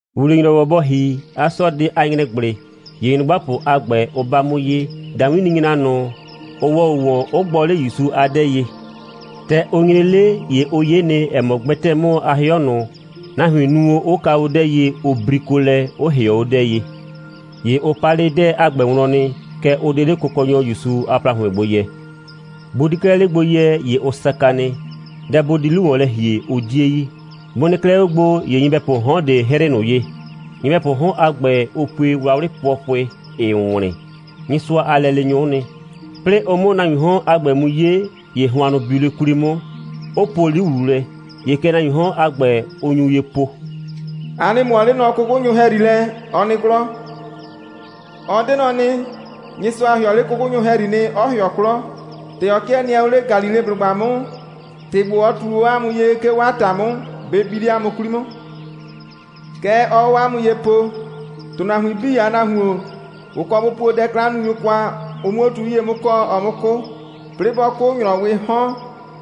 ‑Wuwle‑nyrɔwɔ bɔ ‑hi a 'sɔɔdɩ a ‑nyrɛgblɩ, ‑ye nyrʋgbapʋ a ‑gbɛ, ʋ 'ba 'mʋ ye, ‑dawinninyra ꞊nʋ, ʋ ‑wɔ o ‑wɔn, 'ʋ gbɔ 'le ‑Yusu a 'dɛɛ ye. ‑Tɛ ʋ nyre 'le, ‑ye ʋ 'ye nɩ, ‑ɛ mɔ, gbɛtɛɛ 'mʋ a 'hɩɔ ꞊nʋ, nahuin nu o, 'ʋ ka o 'dɛɛ ye, ʋ briko lɛ, 'ʋ ‑hɩɔ 'o 'dɛɛ ye. ‑Ye ʋ pa 'le 'dɛɛ a ‑gbɛ wlɔn nɩ, kɛɛ, ʋ 'de 'le Kʋkɔnyɔ ‑Yusu a ‑plahʋɩn gbo yɛ. Bʋ 'di 'klɛɛ 'le gbo yɛ, ‑ye ʋ saka nɩ. Dɛ bʋ di 'lu ‑wɔn lɛ ‑hie, ʋ 'die yi. Bʋ nɩ 'klɛɛ 'o gbo, ‑ye nyɩbɛpʋʋ 'hɔn ꞊de 'hrɩɩ ꞊nʋ ye. Nyɩbɛpʋʋ 'hɔn a ‑gbɛ, ʋ pue wlawlɩ pʋɔpʋɩ, 'ɩɩ wlɩn. Nyɩsʋa a lɛleenyʋ'ʋ nɩ. 'Plɩɩ ʋ 'mʋ nahuiin 'hɔn a ‑gbɛ mu 'ye, ‑ye hʋannʋ biu 'le 'kwli 'mʋ, 'ʋ po 'li ‑wlu lɛ. ‑Ye kɛ nahuiin 'hɔn a ‑gbɛ, ʋ nyu ye po: «A nɩ ꞊mʋɔ 'le nɔ 'kʋkʋnyʋ ‑hɛyri lɛ. Ɔ nɩ 'klɔ. Ɔ 'de nɔ nɩ. Nyɩsʋa ‑hɩɔ 'le 'kʋkʋnyʋ ‑hɛyri nɩ, 'ɔ ‑hɩɔ 'klɔ. ‑Tɛ ɔ 'kɩɛ nɩɛ o 'le Galileblʋgba 'mʋ, ‑tɩ ‑gbo, ɔ ꞊tu o 'a mʋ ye, 'ke 'o 'a ‑ta 'mʋ, bɩ bi 'le 'a mʋ 'kwli 'mʋ. Kɛ ɔɔ o 'a mʋ ye po: ‑Tʋnahuin 'bii a Nahuon, ʋ kɔ bʋ puo dɛ'klannunyʋ kwa, ʋ 'muo 'o tu 'yie 'mʋ kɔɔ, ɔ 'mʋ 'kʋ. 'Plɩɩ 'bɔ 'kʋ, ‑nyrɔwɩɩ 'hɔn,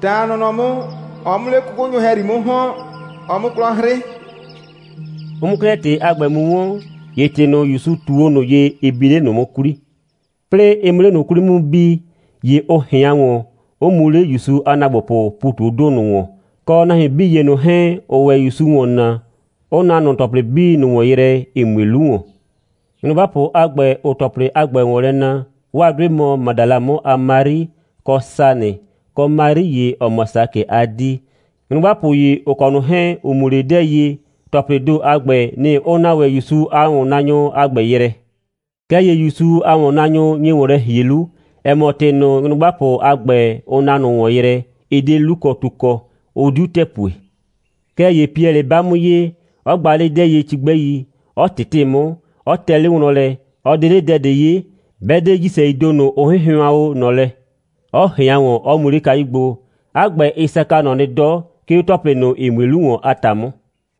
ta a nɔnɔ 'mʋ, ɔ 'mʋ 'le 'kʋkʋnyʋ ‑hɛyri 'mʋ ‑hɔn, ɔ 'mʋ 'klɔ 'hrɩ.» Ʋ 'mʋ 'klɛɛ ‑tɩ a ‑gbɛ mu 'wɔn, ‑ye ‑tɩ ꞊nʋ, ‑Yusu ꞊tu o ꞊nʋ ye, ɩ bi 'le ꞊nʋ 'mʋ 'kwli. 'Plɩɩ ɩ 'mʋ 'le ꞊nʋ 'kwli 'mʋ mu bi, ‑ye ʋ ꞊hɩan ‑wɔn, 'ʋ mu 'le ‑Yusu a ‑naagbopʋʋ ‑pu ꞊tu 'o ‑do ꞊nʋ ‑wɔn, kɔ nahuin 'bii ‑ye ꞊nʋ 'hɛɛn, ‑ʋʋ ‑wɛ ‑Yusu ‑wɔn naa, 'ʋ na ꞊nʋ ‑tɔplɩ 'bii ꞊nʋ ‑wɔn yrɛ, ‑ɩ mue 'lu ‑wɔn. Nyrʋgbapʋ a ‑gbɛ, ‑ʋʋ ‑tɔplɩ a ‑gbɛ ‑wɔn lɛ na, 'waa 'dʋɩ mɔ Madala 'mʋ a Mari, kɔ Sanɩ, kɔ Mari ‑ye, ‑ɔ mɔ Sakɩ a 'dii. Nyrʋgbapʋ ‑ye, ‑ʋ kɔ ꞊nʋ 'hɛɛn, ‑ʋ mu 'le 'dɛɛ ye, ‑tɔplɩɩ ‑do a ‑gbɛ, nɩ‑ ʋ na ‑wɛ ‑Yusu a ‑wɔnnaanyʋ a ‑gbɛ yrɛ. Kɛɛ ‑ye ‑Yusu a ‑wɔnnaanyʋ nye ‑wɔn lɛ ‑hie 'lu, ‑ɛ mɔ, ‑tɩ ꞊nʋ, nyrʋgbapʋ a ‑gbɛ, ʋ na ꞊nʋ ‑wɔn yrɛ, ɩ 'de 'lukɔtu kɔ, 'ʋ 'diu ‑tɛɛ pue. Kɛɛ ‑ye Piɛlɩ 'ba 'mʋ ye, 'ɔ gba 'le 'dɛɛ ye cigbɛi, 'ɔ ꞊tɩtɩ 'mʋ, 'ɔ tɛ 'le wlɔn lɛ, 'ɔ 'de 'le dɛ ꞊de 'ye, 'bɛ 'de ‑jisɛii ‑do ꞊nʋ, ʋ 'hɩnhɩʋan o ꞊nɔ lɛ, 'ɔ ꞊hɩan ‑wɔn, 'ɔ mu 'le kayu gbo. 'A ‑gbɛ, ɩ saka ꞊nɔ nɩ 'dɔ, 'ke 'o ‑tɔplɩ ꞊nʋ, ‑ɩ mue 'lu ‑wɔn a ‑ta 'mʋ.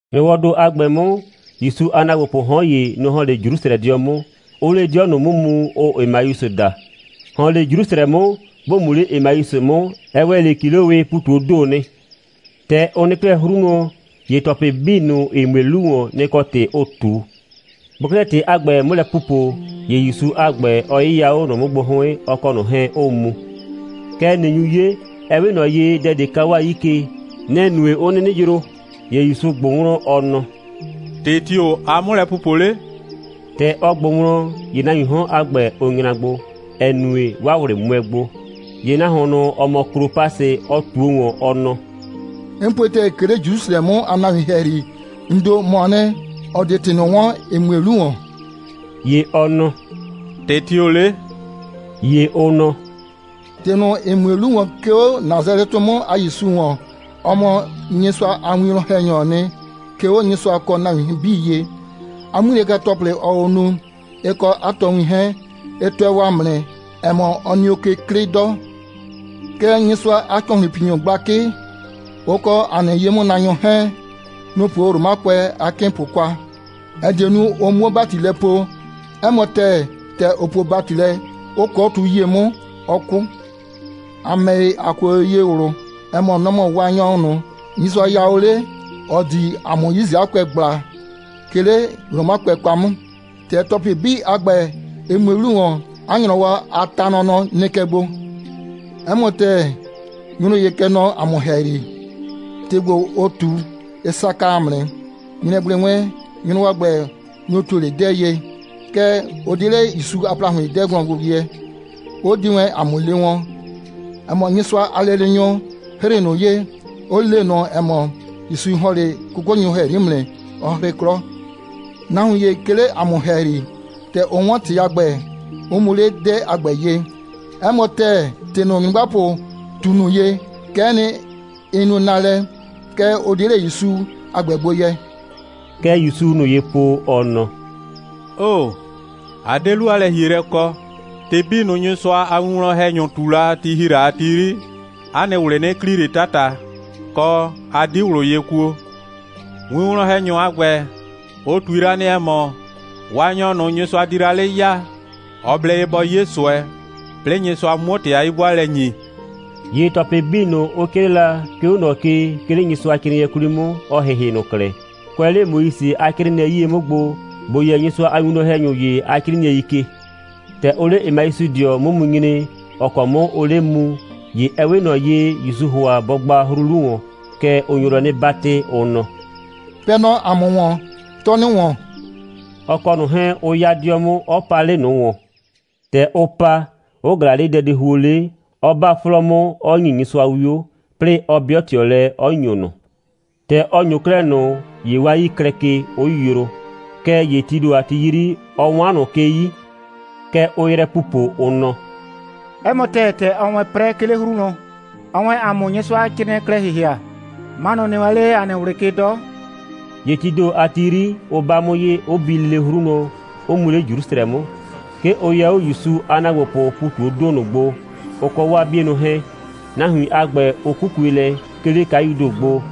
‑Nyrɔwɔɔ ‑do a ‑gbɛ 'mʋ, ‑Yusu a ‑naagbopʋʋ 'hɔn ‑ye, nɔ‑ ‑hɔn 'le Jrusrɛdɩɔ 'mʋ, 'ʋʋ 'le 'dɩɔ ꞊nʋ 'mʋ mu, ʋʋ Emausɩ daa. ‑Hɔn 'le Jrusrɛ 'mʋ, ‑bo mu 'le Emausɩ 'mʋ, ɛ ‑wɛ 'le ‑kilowɩɩ ‑pu ꞊tu 'o ‑do nɩ. ‑Tɛ ʋ nɩ 'klɛɛ 'hru wlɔn, ‑ye ‑tɔplɩ 'bii ꞊nʋ, ‑ɩ mue 'lu ‑wɔn, nɩ‑ kɔ ‑tɩ ʋʋ ꞊tu. Bʋʋ 'klɛɛ ‑tɩ a ‑gbɛ 'mʋ lɛ pupo, ‑ye ‑Yusu a ‑gbɛ, ɔ 'yɩya 'o ꞊nʋ 'mʋ gbo 'hʋɩn, ɔ kɔ ꞊nʋ 'hɛɛn 'ʋʋ mu. Kɛɛ, ꞊nɩ nyu 'ye, ɛ 'we ꞊nɔ ye, dɛ ꞊de ka 'waa 'yii ke. Nɛ‑ nue, 'ʋ 'nɩnɩ yroo. ‑Ye ‑Yusu ꞊gbʋ wlɔn, ɔ nɔ: «‑Tɩ tio‑ aa 'mʋ lɛ pupo 'le?» ‑Tɛ ɔ ꞊gbʋ wlɔn, ‑ye nahuiin 'hɔn a ‑gbɛ, ʋ nyra gbo, ‑ɛ nue, 'waa ꞊wlɩ 'mʋɛ gbo. ‑Ye nahuon ꞊nʋ, ‑ɔ mɔ Klopasɩ, ɔ ꞊tuo ‑wɔn, ɔ nɔ: «'N pue ‑tɛɛ, 'ke 'le Jrusrɛ 'mʋ a nahuin ‑hɛyri, ‑n ‑do, ‑mɔɔ nɩ, ‑ɔ 'de ‑tɩ ꞊nʋ 'wɔn, ‑ɩ mue 'lu ‑wɔn.» ‑Ye ɔ nɔ: «‑Tɩ tio‑ 'le?» ‑Ye ʋ nɔ: «‑Tɩ ꞊nʋ, ‑ɩ mue 'lu ‑wɔn, 'ke 'o Nasalɛtɩ 'mʋ a ‑Yusu ‑wɔn. Ɔ mɔ Nyɩsʋa a winwlɔn‑hɛnyɔɔ nɩ. 'Ke 'o Nyɩsʋa kɔ nahuin 'bii ye, 'a 'ŋmilɛka‑tɔplɩ, ɔɔ o nu, ɩ kɔ 'a tɔɔwin 'hɛɛn, ɩ tʋɛ o ‑a mʋ nɩ, ‑ɛ mɔ, ɔ nɩ o ke 'klɩ 'dɔ. Kɛɛ, Nyɩsʋa a ‑cɔhlʋnpinyʋ gblakɩ, ʋ kɔ ‑a nɩ ye'mʋnaanyʋ 'hɛɛn, nʋ‑ puo Romakʋɛ a 'kɩɩnpʋ kwa, ‑ɛ die nu, ʋ 'muo ‑bati lɛ poo. 'Ɛ mɔ ‑tɛɛ, ‑tɛ ʋ puo ‑bati lɛ, 'ʋ kʋɔ tu 'yie 'mʋ, 'ɔ 'kʋ. ‑A ‑mɛ ‑ye, ‑a kue o ye ꞊wlʋ, ‑ɛ mɔ, nɔ‑ mɔ Waanyɔ ꞊nʋ, Nyɩsʋa ya o 'le, ‑ɔ di ‑a mʋ Yisraɛkʋɛ ꞊gbla, 'ke 'le Romakʋɛ kwa 'mʋ. ‑Tɛ ‑tɔplɩ 'bii a ‑gbɛ, ɩ mue 'lu ‑wɔn, 'a ‑nyrɔwɔ a ta nɔnɔ nɩ kɛ gbo. 'Ɛ mɔ ‑tɛɛ, nyrʋ ‑ye kɛ nɔ ‑a mʋ ‑hɛyri, ‑tɩ ‑gbo, ʋ ꞊tu, ɩ saka ‑a mʋ nɩ. ‑Nyrɛgblɩ wɛn, nyrʋ a ‑gbɛ, nʋ‑ ‑tuo wɛn 'le 'dɛɛ ye, kɛɛ, ʋ 'de 'le ‑Yusu a ‑plahʋɩn 'dɛɛ wlɔn gbo yɛ, 'ʋ di wɛn ‑a mʋ le wɔn, ‑ɛ mɔ, Nyɩsʋa a lɛleenyʋ 'hrɩɩ ꞊nʋ ye, 'ʋ le ꞊nʋ, ‑ɛ mɔ, ‑Yusu ‑hɔn 'le 'kʋkʋnyʋ ‑hɛyri 'mʋ nɩ, 'ɔ 'hrɩ 'klɔ. Nahuin ‑ye 'ke 'le ‑a mʋ ‑hɛyri, ‑tɛ ʋ 'wɔn ‑tɩ a ‑gbɛ, 'ʋ mu 'le 'dɛɛ a ‑gbɛ ye. 'Ɛ mɔ ‑tɛɛ, ‑tɩ ꞊nʋ, nyrʋgbapʋ ꞊tu ꞊nʋ ye, kɛ'ɛ nɩ, ɩ nu naalɛ, kɛɛ, ʋ 'de 'le ‑Yusu a ‑gbɛ gbo yɛ.» Kɛ ‑Yusuu ꞊nʋ ye po, ɔ nɔ: «'Oo‑, a 'de 'lu a lɛ‑hielɛ kɔ. ‑Tɩ 'bii ꞊nʋ, Nyɩsʋa a winwlɔn‑hɛnyʋ ꞊tu la, ti ‑hi la a ti 'yri, 'a nɩ ꞊wlɩ 'nɩ kli ꞊le 'tata, kɔ, 'a 'di ꞊wlʋ ye kuo. Winwlɔn‑hɛnyʋ a ‑gbɛ, ʋ ꞊tui la nɩ, ‑ɛ mɔ, Waanyɔ ꞊nʋ, Nyɩsʋa di la 'le ya, ɔ blɛ ye bɔ 'ye ꞊sʋɛ, 'plɩɩ Nyɩsʋa 'muo ‑tɩ a 'yi'bʋaalɛ ‑nyi.» ‑Ye ‑tɔplɩ 'bii ꞊nʋ, ʋ 'crɩɩ la, 'ke 'o ꞊nɔ ke, 'ke 'le Nyɩsʋacrɩɩnɩɛ 'kwli 'mʋ, ɔ ‑hɩhɩ ꞊nʋ klɛ, kʋɛ 'le Moise a 'crɩɩnɩɛi 'yie 'mʋ gbo, ‑bo yɛ Nyɩsʋa a winwlɔn‑hɛnyʋ ‑ye a 'crɩɩnɩɛi ke. ‑Tɛ ʋʋ 'le Emausɩdɩɔ 'mʋ mu nyre, ‑ɔ kɔ 'mʋ ʋʋ 'le mu, ‑ye ɛ 'we ꞊nɔ ye, ‑Yusuu ‑hʋa bɔ gba 'hru 'lu ‑wɔn. Kɛɛ, ʋ nyo lɛ 'nɩ 'batɩ, ʋ nɔ: «Pɛɛ nɔ ‑a mʋ ‑wɔn, 'tɔɔ 'nɩ ‑wɔn,» ɔ kɔ ꞊nʋ 'hɛɛn 'ʋ 'ya 'dɩɔ 'mʋ, 'ɔ pa 'le ꞊nʋ ‑wɔn. ‑Tɛ ʋ pa, 'ʋ ꞊glaa 'le dɛdihuo 'le, 'ɔ 'ba 'flɔɔ 'mʋ, 'ɔ ‑nyi Nyɩsʋa 'wio, 'plɩɩ 'ɔ 'bɩɔ ꞊tɩɔ lɛ, 'ɔ ‑nyo ꞊nʋ. ‑Tɛ ɔ ‑nyo 'klɛɛ ꞊nʋ, ‑ye 'waa 'yii klɛ ke, 'ʋ yroo. Kɛɛ ‑ye tii ‑do a ti 'yri, ɔ 'wan ꞊nʋ ke 'yi. Kɛ ʋʋ yrɛ pupo, ʋ nɔ: «'Ɛ mɔ ‑tɛɛ, ‑tɛ ɔɔ wɛn 'prɛ, 'ke 'le 'hru wlɔn, ɔɔ wɛn ‑a mʋ Nyɩsʋacrɩɩnɩɛ klɛ ‑hɩhɩa, 'manʋ nɩ wɛn 'le ‑a nɩ ꞊wlɩ ke 'dɔ.» ‑Ye tii ‑do a ti 'yri, ʋ 'ba 'mʋ ye, 'ʋ bi lele 'hru wlɔn, 'ʋ mu 'le Jrusrɛ 'mʋ. 'Ke ʋ yɛ 'o ‑Yusu a ‑naagbopʋʋ ‑pu ꞊tu 'o ‑do ꞊nʋ gbo, ʋ kɔ 'waa 'bienʋ 'hɛɛn. Nahuin a ‑gbɛ, ʋ 'kukue lɛ, 'ke 'le kayuu ‑do gbo,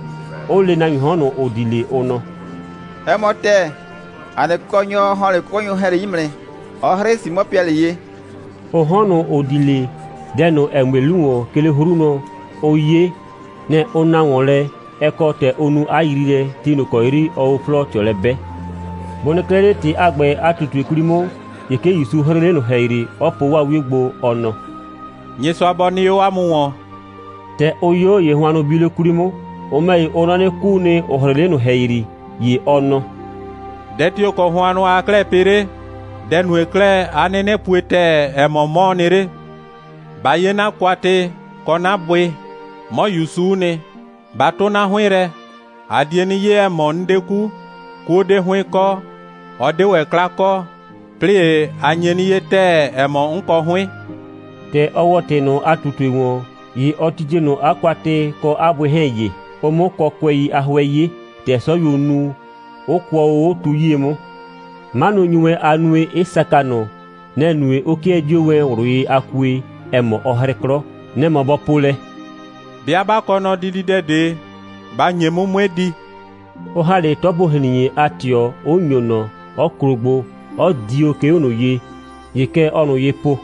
'ʋ le nahuiin 'hɔn ꞊nʋ, ‑ʋ di 'le, ʋ nɔ: «'Ɛ mɔ ‑tɛɛ, ‑a nɩ Kʋkɔnyɔ ‑hɔn 'le 'kʋkʋnyʋ ‑hɛyri 'mʋ nɩ, 'ɔ 'hrɩɩ Simɔ Piɛlɩ ye.» Ʋ 'hɔn ꞊nʋ, ‑ʋ di 'le, dɛ ꞊nʋ, ‑ɛ mue 'lu ‑wɔn, 'ke 'le 'hru wlɔn, ʋ 'ye, nɩ‑ ʋ na ‑wɔn lɛ, ɛ kɔ ‑tɛ ʋ nu 'a yriilɛ, ti ꞊nʋ ‑kɔ 'yri ɔɔ 'o 'flɔɔ ꞊tɩɔ lɛ 'bɛɛ. Bʋ nɩ 'klɛɛ 'le ‑tɩ a ‑gbɛ a ꞊tutue 'kwli 'mʋ, ‑ye 'ke ‑Yusu 'hrɩɩ 'le ꞊nʋ ‑hɛyri, 'ɔ po 'waa 'wio gbo, ɔ nɔ: «Nyɩsʋa bɔ nɩ 'o 'a mʋ ‑wɔn!» ‑Tɛ ʋ 'yo, ‑ye hʋannʋ biu 'le 'kwli 'mʋ. Ʋ ‑mɛ ‑ye, ʋ nɔ 'nɩ, 'kuu nɩ, ‑ʋ 'hrɩɩ 'le ꞊nʋ ‑hɛyri. ‑Ye ɔ nɔ: «Dɛ tio‑ kɔ hʋannʋ aa 'klɛɛ pɩ 'le? Dɛ‑ nue 'klɛɛ, 'a 'nɩnɩ pue ‑tɛɛ, ‑ɛ mɔ, 'mɔɔ nɩ 'le? Ba 'ye 'na kwatɩ kɔ 'na bʋɩ. 'Mɔ ‑Yusu'u nɩ. Ba 'tʋ 'na 'hʋɩn lɛ. A die 'nɩ 'ye, ‑ɛ mɔ, 'n 'de 'ku. 'Kuo 'de 'hʋɩn kɔ, ɔ 'de ‑wɛ 'kla kɔ, 'plɩɩ ‑ye, a nye 'nɩ 'ye ‑tɛɛ, ‑ɛ mɔ, 'n kɔ 'hʋɩn.» ‑Tɛ ɔ ‑wɔ ‑tɩ ꞊nʋ a ꞊tutue ‑wɔn, ‑ye ɔ titie ꞊nʋ 'a kwatɩ kɔ 'a bʋɩ 'hɛɛn ye, (ʋ 'mʋ kɔkʋɛi a 'hʋɛ 'ye, ‑tɛ 'sɔyuo nu, 'ʋ kʋɔ o 'o tu 'yie 'mʋ.) 'Manʋ nyu wɛn a nue, 'ɩ saka ꞊nʋ. Nɛ‑ nue, 'ʋ 'kɩɛ 'dio wɛn ꞊wlʋ ye a kue, ‑ɛ mɔ, ɔ 'hrɩ 'klɔ. Nɛ‑ mɔ, bɔ po lɛ: «'Bɩa 'ba kɔɔ nɔ dididɛ ꞊de, ba ‑nye 'mʋ, 'mue di!» 'ʋ ‑ha 'le 'tɔpo‑hrin.e a ꞊tɩɔ, 'ʋ ‑nyo ꞊nɔ, 'ɔ klo gbo, 'ɔ dio, 'ke 'o ꞊nʋ ye. ‑Ye kɛ ɔɔ ꞊nʋ ye po: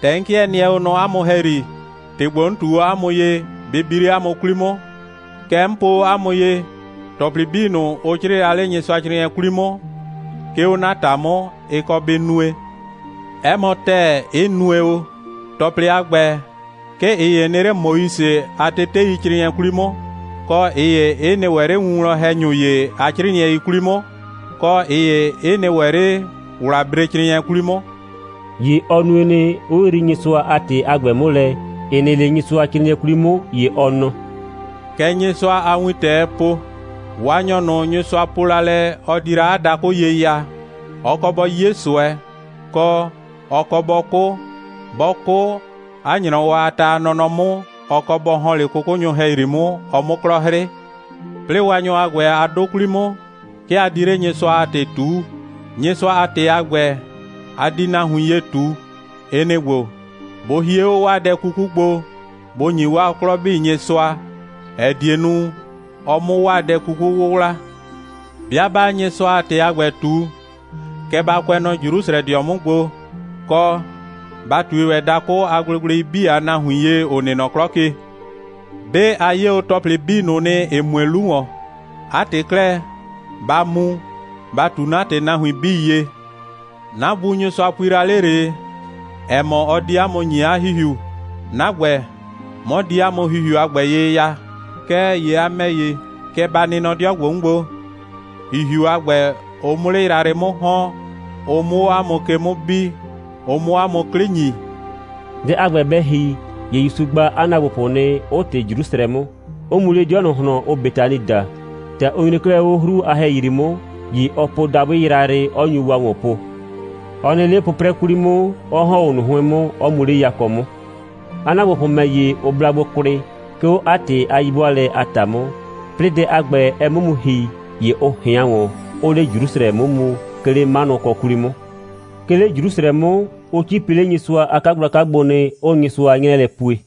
«‑Tɛ 'n 'kɩɛ nɩɛ o nɔ 'a mʋ ‑hɛyri, ‑tɩ ‑gbo, 'n ꞊tu o 'a mʋ ye, bɩ bi 'le 'a mʋ 'kwli 'mʋ. Kɛ 'n po o 'a mʋ ye: ‑Tɔplɩ 'bii ꞊nʋ, ʋ 'crɩɩ la 'le Nyɩsʋacrɩɩnɩɛ 'kwli 'mʋ, 'ke 'o 'na ‑ta 'mʋ, ɩ kɔ bɩ nue. 'Ɛ mɔ ‑tɛɛ, 'ɩ nue o. ‑Tɔplɩ a ‑gbɛ, 'ke ꞊ɩ ‑ye nɩ 'le Moise a teteicrɩɩnɩɛ 'kwli 'mʋ, kɔ, ꞊ɩ ‑ye 'ɩ nɩ ‑wɛ 'le winwlɔn‑hɛnyʋ ‑ye a 'crɩɩnɩɛi 'kwli 'mʋ, kɔ, ꞊ɩ ‑ye 'ɩ nɩ ‑wɛ 'le ‑wlabrecrɩɩnɩɛ 'kwli 'mʋ.» ‑Ye ɔ nue nɩ, 'ʋ yrii Nyɩsʋa a ‑tɩ a ‑gbɛ 'mʋ lɛ, ‑ɩ nɩ 'le Nyɩsʋacrɩɩnɩɛ 'kwli 'mʋ. ‑Ye ɔ nɔ: «Kɛ Nyɩsʋa a wintɛɛ po: Waanyɔ ꞊nʋ, Nyɩsʋa po la lɛ, ɔ di la 'a dakʋ ye ya, ɔ kɔ bɔ 'ye ꞊sʋɛ, kɔ, ɔ kɔ bɔ 'kʋ. 'Bɔ 'kʋ, 'a ‑nyrɔwɔ a ta a nɔnɔ 'mʋ, ɔ kɔ bɔ ‑hɔn 'le 'kʋkʋnyʋ ‑hɛyri 'mʋ, ɔ 'mʋ 'klɔ 'hrɩ. 'Plɩɩ Waanyɔ a ‑gbɛ a 'dʋ 'kwli 'mʋ, 'ke a di 'le Nyɩsʋa a ‑tɩ ꞊tuu. Nyɩsʋa a ‑tɩ a gbɛ, a di nahuin ye ꞊tu, ɩ nɩ‑ ‑gbo: Bʋ hie 'o 'waa dɛ 'kuku gbo, bʋ ‑nyi 'waa 'klɔ 'bii Nyɩsʋa, ‑ɛ die nu, ɔ 'mʋ 'waa dɛ 'kuku 'wʋwla. 'Bɩa 'baa Nyɩsʋa a ‑tɩ a ‑gbɛ ꞊tu, kɛ ba kʋɛ nɔ Jrusrɛdɩɔ 'mʋ gbo, kɔ, ba ꞊tui ‑wɛ dakʋ a gblegblei 'bii a nahuin ye, ‑ʋ nɩ nɔ 'klɔ ke. 'Be a 'ye o ‑tɔplɩ 'bii ꞊nʋ nɩ, ‑ɩ mue o 'lu ‑wɔn. 'A ‑tɩ 'klɛɛ, ba mu, ba ꞊tu 'na ‑tɩ nahuin 'bii ye. 'Na Bu Nyɩsʋa pui la 'le ꞊le, ‑ɛ mɔ, ɔ di 'a mʋ ‑nyi 'a ‑Hihiu. 'Na ‑gbɛ, 'mɔ di 'a mʋ ‑Hihiu a ‑gbɛ ye ya. Kɛɛ ‑ye a ‑mɛ ‑ye, kɛ ba nɩ nɔ 'dɩɔ ‑gbo 'mʋ gbo, ‑Hihiu a ‑gbɛ, ʋ 'mʋ 'le yrayrɩ 'mʋ ‑hɔn, ʋ 'mʋ 'o 'a mʋ ke 'mʋ bi, ʋ 'mʋ 'a mʋ 'klɩ ‑nyi.» Dɛ a ‑gbɛ bɛ ‑hi, ‑ye ‑Yusu gba 'a ‑naagbopʋ nɩ, 'ʋ ꞊tɩ Jrusrɛ 'mʋ, 'ʋ mu 'le 'dɩɔ ꞊nʋ ꞊hlɔn, ʋʋ Betani daa. ‑Tɛ ʋ nyre 'klɛɛ 'o 'hru a ‑hɛyri 'mʋ, ‑ye ɔ po dabʋɩ yrayrɩ, 'ɔ nyu wa ‑wɔn po. Ɔ nɩ 'le 'pʋprɛ 'kwli 'mʋ, 'ɔ ‑hɔn 'o ꞊nʋ 'hʋɩn 'mʋ, 'ɔ mu 'le yakɔ 'mʋ. 'A ‑naagbopʋ ‑mɛ ‑ye, ʋ bla gbo kwlɩ, 'ke 'o 'a ‑tɩ a 'yi'bʋaalɛ a ‑ta 'mʋ. 'Plɩɩ dɛ a ‑gbɛ, ɛ 'mʋ mu ‑hi, ‑ye ʋ ꞊hɩan ‑wɔn, 'ʋʋ 'le Jrusrɛ 'mʋ mu, 'ke 'le 'manʋkɔ 'kwli 'mʋ. 'Ke 'le Jrusrɛ 'mʋ, ʋ 'cipi 'le Nyɩsʋa a 'kagblaka gbo nɩ, 'ʋʋ Nyɩsʋa 'nyrɛɛ lɛ pue.